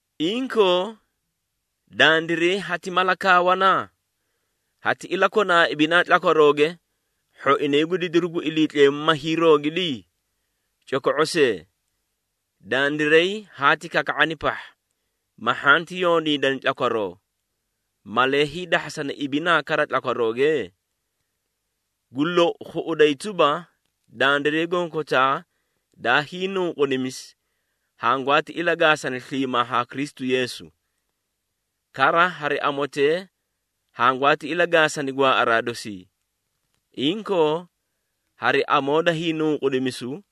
Inkoo, dandiray hati mala kaawana? Hati ilakona ibinaa tlakwarooge, hhoinay gu didiru gu Iliitleemu ma hiiroogidi? Coko⁄o see! Dandiray haati kaka⁄ani pahha, ma hhanti yondiidani tlakwaroo, malee hiidahhasana ibinaa kara tlakwarooge? Gu lou khuꞌuday tuba, dandiray gonkotaa daa hiinunqudimisi hangwaati ilagaasani sliimaa haa Kristu Yeesu. Kara hari amotee hangwaati ilagaasani gwaaꞌaraa dosii. Inkoo, hari amoo da hiinunqudimisu,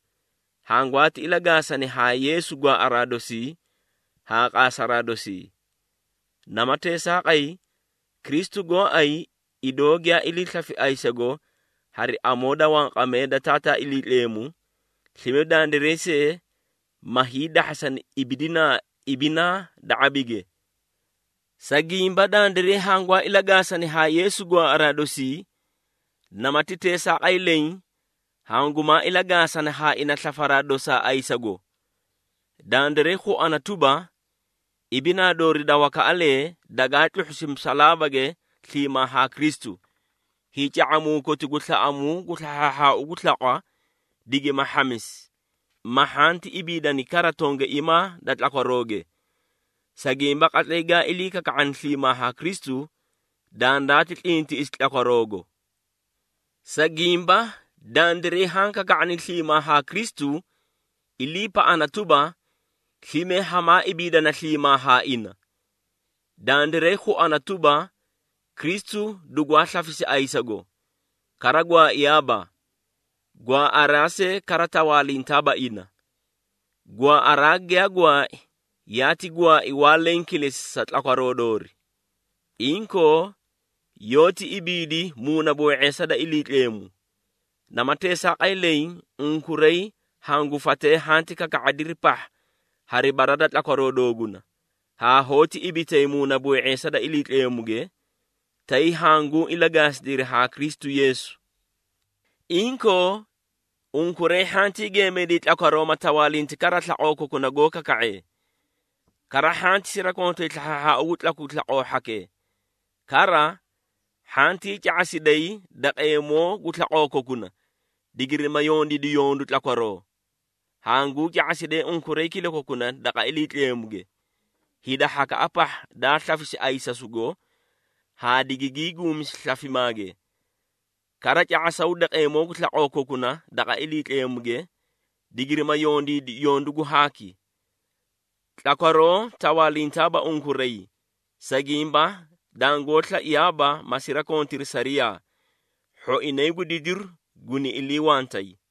hangwaati ilagaasani haa Yeesu gwaaꞌaraa dosii haa qaasaraa dosii. Nama teesaaqay, Kristu gooay idoo giyaa ilii slafi ayisago hari amoo da wanqamee da Taataa Iliitleemu, slime dandiray see, ma hiidahhasani ibidinaa ibinaa da ⁄abige. Sa gimba dandiray hangwaa ilagaasani haa Yeesu gwaaꞌaraa dosii, namati teesaaqay leẽ hangumaa ilagaasana haa ina slafaraa dosaa ayisasugo. Dandiray khuana tuba, ibinaa doori da wakaꞌalee dagaa tluhhusi musalaabage sliimaa haa Kristu, hiica⁄amuu koti gu slaꞌamuu gu slahhaahhaau gu slaqwa, digima hhamisi, ma hhanti ibiidani kara tongaiimaa da tlakwarooge. Sa gimba qatlay gaa ilii kaka⁄ani sliimaa haa Kristu, dandaati tlintiꞌisi tlakwaroogo. Sa gimba dandiray haã kaka⁄ani sliimaa haa Kristu, iliipaꞌana tuba, slime hamaa ibiidana sliimaa haa ina. Dandiray khuana tuba, Kristu dugwaa slafisi ayisago, kara gwaaiyaaba. Gwaaꞌaraa see kara tawaalintaaba ina. Gwaaꞌaraa giyaa gwaai, yaati gwaai waa lenge kilesi sa tlakwaroo doori. Inkoo, yoóti ibiidi muunaboo⁄eesa da Iliitleemu. Nama teesaaqay leẽ, unkuray hangu fatee hanti kaka⁄adiri pahha hari bara da tlakwaroo dooguna, haa hoóti ibitay muunaboo⁄eesa da Iliitleemuge, tay hanguu ilagaasidiri haa Kristu Yeesu. Inkoo, unkuray hhantii geemayday tlakwaroo ma tawaalinti kara slaqoo kokuna, goó kaka⁄ee. Kara hhanti sirakontay slahhaahhaau gu tlaku gu slaqoo hhakee. Kara, hhantii ca⁄asiday daqeemoo gu slaqoo kokuna, digirima yondiidi yondu tlakwaroo. Hanguu ca⁄asidee unkuray kilakokuna daqa Iliitleemuge, hida hhakaꞌa pahha daa slafisi ayisasugo, haa digigii guumisi slafimaage. Kara ca⁄asaw daqeemoo gu slaqoo kokuna daqa Iliitleemuge, digirima yondiidi yondu gu haaki. Tlakwaroo tawaalintaaba unkuray, sa gimba dangoó slaiyaaba ma sirakontiri sariyaa, hhoinay gu didiru guni iliiwantay.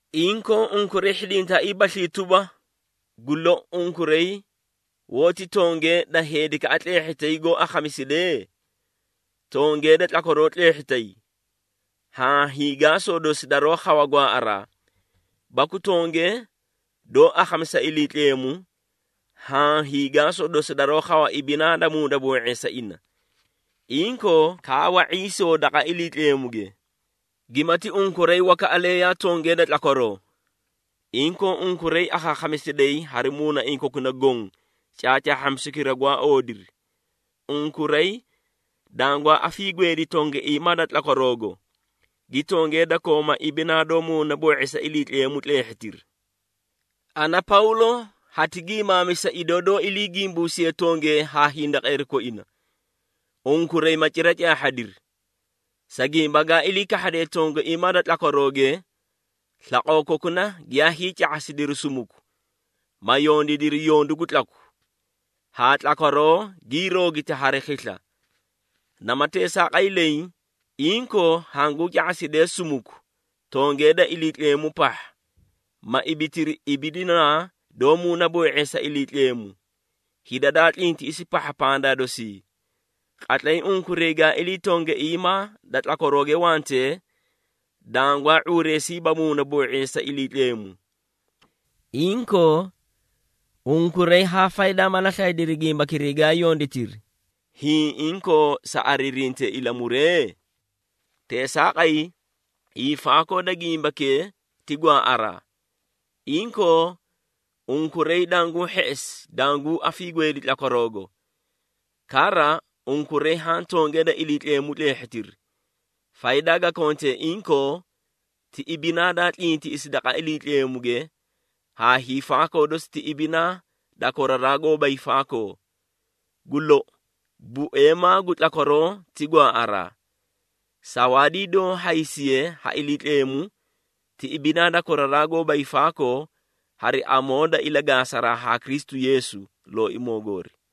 Inkoo, unkuray hhidintaaiibaslii tuba, gu lou unkuray hoóti tongee da heedikee tleehhitay goó akhamisidee? Tongee da tlakwaroo tleehhitay, haã hiigaasoo dosi daroó khawa gwaaꞌaraa, baku tongee doó akhamisa Iliitleemu, haã hiigaasoo dosi daroó khawa ibinaa doó muunaboo⁄eesa ina. Inkoo, kaawa ⁄iisoo daqa Iliitleemuge! Gimati unkuray wakaꞌalee yaa tongee da tlakwaroo, inkoo unkuray akhaakhamisidayi hari muunaiĩ kokuna goõ, caacaahhamisukira gwaa oodiri. Unkuray dangwaa afiigweedi tongaiimaa da tlakwaroogo, gi tongee da kooma ibinaa doó muunaboo⁄eesa Iliitleemu tleehhitiri. Ana, Pawlo hati giimaamisa, idoo doó ilii gimbuusiye tongee haa hindaqeeri koina, unkuray ma cira caahhadiri. Sa gimba gaa ilii kahhadee tongaiimaa da tlakwarooge, slaqoo kokuna giyaa hiica⁄asidiri sumuku, ma yondiidiri yondu gu tlaku, haa tlakwaroo gii roogiti hari khisla. Nama teesaaqay leẽ, inkoo hanguu ca⁄asidee sumuku tongee da Iliitleemu pahha, ma ibitiri ibidinaa doó muunaboo⁄eesa Iliitleemu, hida daa tlintiꞌisi pahha pandaa dosii. Qatlay unkuray gaa ilii tongaiimaa da tlakwarooge wantee, dangwaa ⁄uureesiiba muunaboo⁄eesa Iliitleemu. Inkoo, unkuray haa faydaa mala slaydiri gimbakiray gaa yonditiri, hiĩ inkoo sa ariirintee ilamuree? Teesaaqay, hiifaakoo da gimbakee ti gwaaꞌaraa! Inkoo, unkuray danguu hheꞌesi danguu afiigweedi tlakwaroogo. Kara, unkuray haã tongee da Iliitleemu tleehhitiri, faydaa ga kontee inkoo ti ibinaa daa tlintiꞌisi daqa Iliitleemuge haa hiifaakoo dosi ti ibinaa da koraraa gooba hiifaakoo. Gu lou, bueemaa gu tlakwaroo ti gwaaꞌaraa. Sawaadii doó hadisiye ha Iliitleemu ti ibinaa da koraraa gooba hiifaakoo hari amoo da ilagaasaraa haa Kristu Yeesu, Looimoo goori.